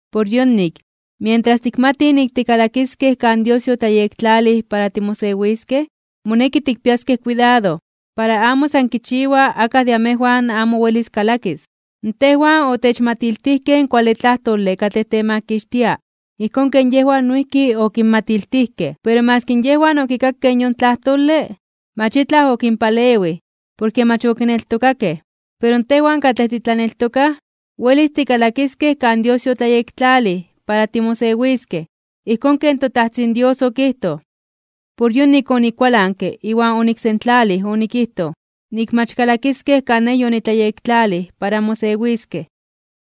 Por yonik, mientras tikmatij nik tikalakiskej kan Dios yotlayektlalij para timosewiskej, moneki tikpiaskej kuidado, para amo san kichiwa akaj de amejwan amo welis kalakis. Tejwan otechmatiltijkej in kuale tlajtole katlej temakixtia ijkón ken yejwan noijki okinmatiltijkej. Pero maski yejwan okikakej yon tlajtole, mach itlaj okinpalewij, porke mach okineltokakej. Pero tejwan, katlej titlaneltokaj, welis tikalakiskej kan Dios yotlayektlalij para timosewiskej. Ijkón ken toTajtzin Dios okijtoj: Por yonik onikualanke iwan oniksentlalij onikijtoj, nik mach kalakiskej kan Nej yonitlayektlalij para mosewiskej.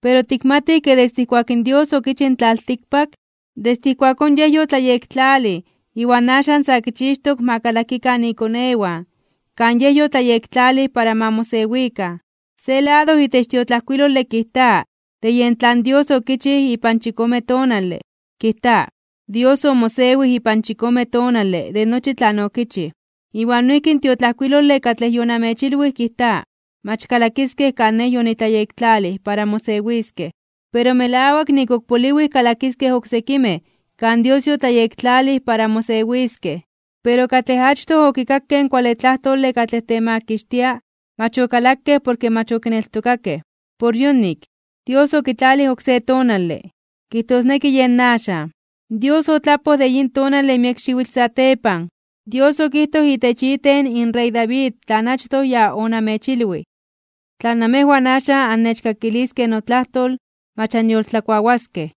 Pero tikmatij ke desde ijkuak in Dios okichij in tlaltikpak, desde ijkuakón Yej yotlayektlalij iwan axan sa kichixtok ma kalakikan ikonewan kan Yej yotlayektlalij para ma mosewikan. Se lado itech in tiotlajkuilole kijta de yen tlan Dios okichij ipan chikome tonale, kijta: Dios omosewij ipan chikome tonale de nochi tlan okichij. Iwan noijki in tiotlajkuilole katlej yonamechilwij kijta: Mach kalakiskej kan Nej yonitlayektlalij para mosewiskej. Pero melawak nik ok poliwij kalakiskej oksekimej kan Dios yotlayektlalij para mosewiskej, pero katlej achtoj okikakej in kuale tlajtole katlej temakixtia mach okalakej porke mach okineltokakej. Por yonik, Dios okitlalij oksé tonale, kijtosneki yen axan. Dios otlapoj de yin tonale miek xiwitl satepan, Dios okijtoj itech iten in rey David tlan achtoj ya onamechilwij: Tla namejwan axan annechkakiliskej notlajtol, mach anyoltlakuawaskej.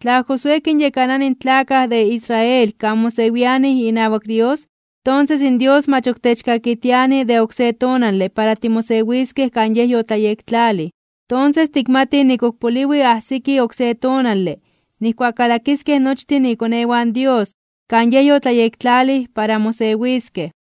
Tla Josué kinyekanani in tlakaj de Israel kan mosewianij inawak Dios, tonses in Dios mach ok techkakitiani de oksé tonale para timosewiskej kan Yej yotlayektlalij. Tonses tikmatij nik ok poliwi ajsiki oksé tonale nijkuak kalakiskej nochtin ikonewan Dios kan Yej yotlayektlalij para mosewiskej.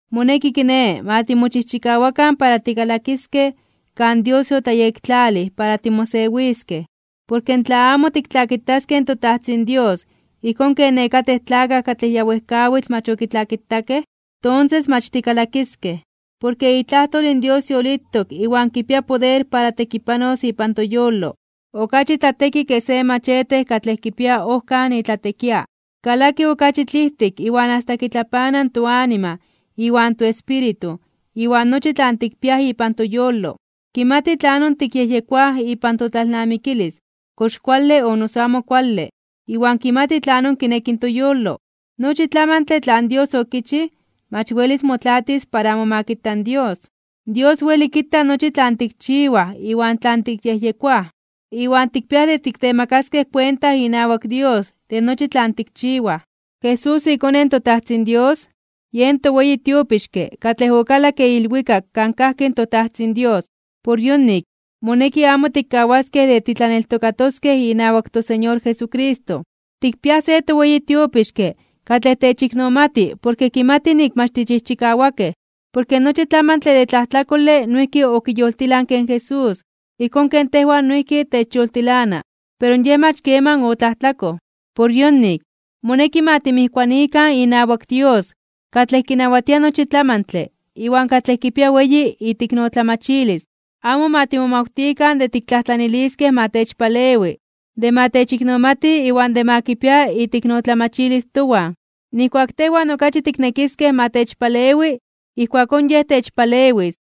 Moneki, kiné, ma timochijchikawakan para tikalakiskej kan Dios yotlayektlalij para timosewiskej, porke tla amo tiktlakitaskej in toTajtzin Dios ijkón ken nekatej tlakaj katlej ya wejkawitl mach okitlakitakej, tonses mach tikalakiskej. Porke itlajtol in Dios yolitok iwan kipia poder para tekipanos ipan toyolo. Okachi tlateki ke se machete katlej kipia ojkan itlatekia, kalaki okachi tlijtik iwan asta kitlapana toanima iwan toespíritu iwan nochi tlan tikpiaj ipan toyolo. Kimati tlanon tikyejyekoaj ipan totlalnamikilis kox kuale o noso amo kuale, iwan kimati tlanon kineki toyolo. Nochi tlamantle tlan Dios okichij mach welis motlaatis para amo ma kita in Dios. Dios weli kita nochi tlan tikchiwaj iwan tlan tikyejyekoaj. Iwan tikpiaj de tiktemakaskej kuenta inawak Dios de nochi tlan tikchiwaj. Jesús, iKone in toTajtzin Dios, yen toweyi tiopixke katlej okalakke ilwikak kan kajki in toTajtzin Dios. Por yonik, moneki amo tikkawaskej de titlaneltokatoskej inawak toSeñor Jesucristo. Tikpiaj se toweyi tiopixke katlej techiknomati porke kimati nik mach tichijchikawakej. Porke nochi tlamantle de tlajtlakole noijki okiyoltilanke in Jesús ijkón ken tejwan noijki techyoltilana, pero Yej mach keman otlajtlakoj. Por yonik, moneki ma timijkuanikan inawak Dios katlej kinawatia nochi tlamantle iwan katlej kipia weyi iteiknotlamachilis. Amo ma timomawtikan de tiktlajtlaniliskej ma techpalewi, de ma techiknomati iwan de ma kipia iteiknotlamachilis towan. Nijkuak tejwan okachi tiknekiskej ma techpalewi ijkuakón Yej techpalewis.